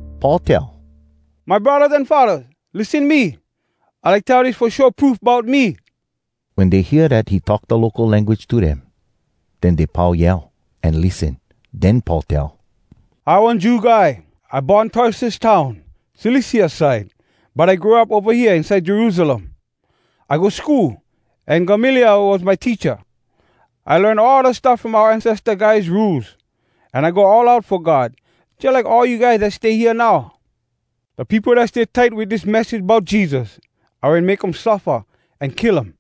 Paul tell, “My braddahs an faddahs, lissen me! I like tell dis fo show proof bout me.” Wen dey hear dat he talk da local language to dem, den dey pau yell, an lissen. Den Paul tell, “I one Jew guy. I born Tarsus town, Cilicia side. But I grow up ova hea inside Jerusalem. I go school, an Gamaliel was my teacha. I learn all da stuff from oua ancesta guys rules, an I go all out fo God jalike all you guys dat stay hea now. Da peopo dat stay tight wit dis message bout Jesus, I wen make um suffa an kill um.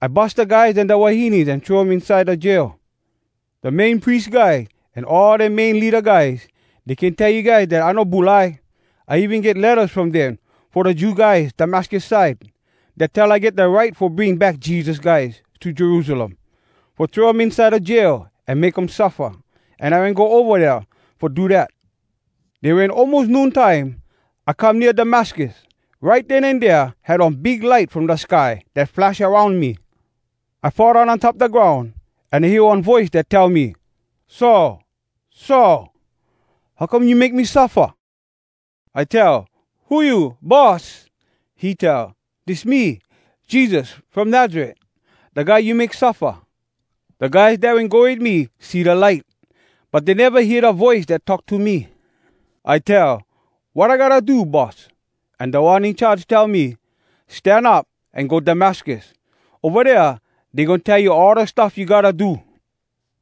I bus da guys an da wahines an throw um inside da jail. Da Main Pries Guy an all da main leada guys, dey can tell you guys dat I no bulai. I even get lettas from dem fo da Jew guys Damascus side, dat tell I get da right fo bring back Jesus guys to Jerusalem, fo throw um inside da jail an make um suffa. An I wen go ova dea fo do dat. “Den wen almos noon time, I come nea Damascus. Right den an dea had one big light from da sky dat flash aroun me. I fall down on top da groun, an I hear one voice dat tell me, ‘Saul! Saul! How come you make me suffa?’ I tell, ‘Who you, Boss?’ He tell, ‘Dis me, Jesus from Nazaret, da guy you make suffa.’ Da guys dat wen go wit me see da light, but dey neva hear da voice dat talk to me. I tell, ‘Wat I gotta do, Boss?’ An Da One In Charge tell me, ‘Stan up an go Damascus. Ova dea dey goin tell you all da stuff you gotta do.’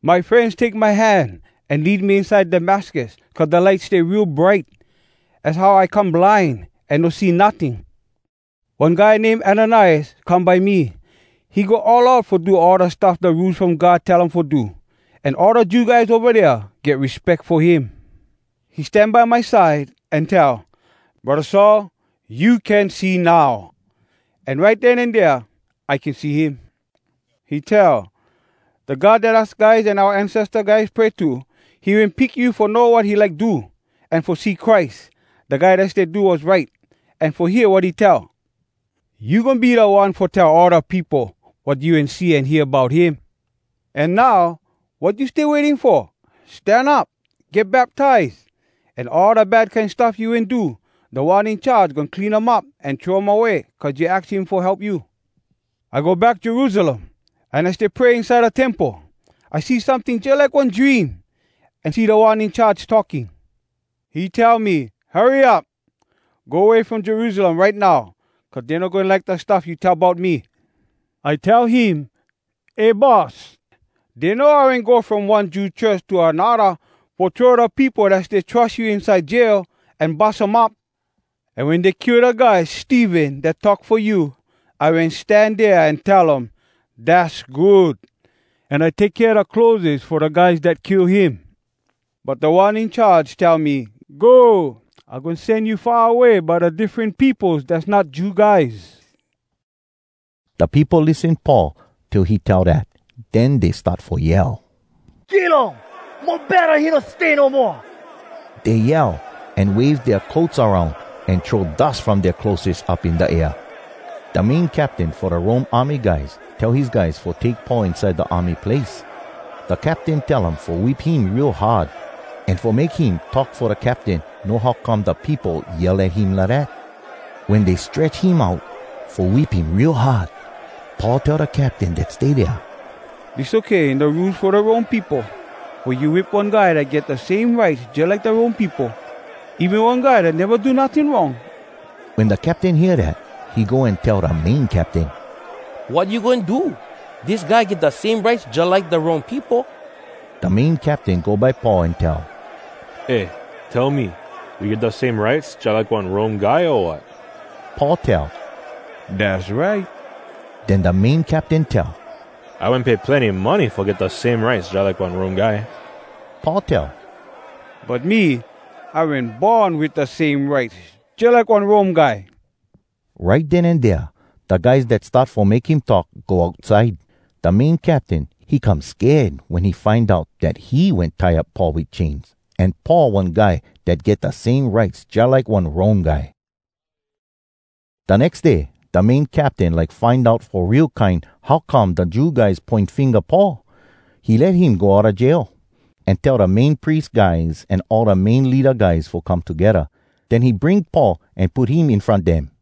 My frenz take my hand an lead me inside Damascus cuz da light stay real bright. Az how I come blind an no see notting. “One guy name Ananias come by me. He go all out fo do all da stuff da Rules From God tell um fo do, an all da Jew guys ova dea get respeck fo him. He stan by my side, an tell, ‘Braddah Saul, you can see now!’ An right den an dea, I can see him. He tell, ‘Da God dat us guys an oua ancesta guys pray to, he wen pick you fo know wat he like do, an fo see Christ, da Guy Dat Stay Do Wass Right, an fo hear wat he tell. You goin be da one fo tell all da peopo wat you wen see an hear bout him. An now, wat you stay waiting fo? Stan up, get baptize. An all da bad kine stuff you wen do, Da One In Charge goin clean um up an throw um away cuz you aks him fo help you.’ “I go back Jerusalem, an I stay pray inside da temple. I see someting jalike one dream, an see Da One In Charge talking. He tell me, ‘Hurry up! Go way from Jerusalem right now cuz dey no goin like da stuff you tell bout me!’ I tell him, ‘Eh Boss, dey know I wen go from one Jew church to anodda fo throw da peopo dat stay trus you inside jail, an bus um up. An wen dey kill da guy Stephen dat talk fo you, I wen stan dea an tell um, “Dass good!” an I take kea da clotheses fo da guys dat kill him.’ But Da One In Charge tell me, ‘Go! I goin sen you far away by da diffren peopos dass not Jew guys.’” Da peopo lissen Paul till he tell dat. Den dey start fo yell, “Kill um! Mo betta he no stay no moa!” Dey yell, an wave dea coats aroun, an throw dus from dea clotheses up in da air. Da main captain fo da Rome army guys tell his guys fo take Paul inside da army place. Da captain tell um fo whip him real hard, an fo make him talk fo da captain know how come da peopo yell at him lidat. Wen dey stretch him out fo whip him real hard, Paul tell da captain dat stay dea, “Dis okay in da rules fo da Rome peopo? Fo you whip one guy dat get da same rights jalike da Rome peopo? Even one guy dat neva do notting wrong?” Wen da captain hear dat, he go an tell da main captain, “Wat you goin do? Dis guy get da same rights jalike da Rome peopo!” Da main captain go by Paul an tell, “Eh, tell me, you get da same rights jalike one Rome guy, o wat?” Paul tell, “Dass right.” Den da main captain tell, “I wen pay plenny money fo get da same rights jalike one Rome guy.” Paul tell, “But me, I wen born wit da same rights jalike one Rome guy.” Right den an dea da guys dat start fo make him talk go outside. Da main captain, he come sked wen he find out dat he wen tie up Paul wit chains, an Paul one guy dat get da same rights jalike one Rome guy. Da nex day, da main captain like find out fo real kine how come da Jew guys poin finga Paul. He let him go outa jail, an tell da Main Pries guys an all da main leada guys fo come togedda. Den he bring Paul an put him in front dem.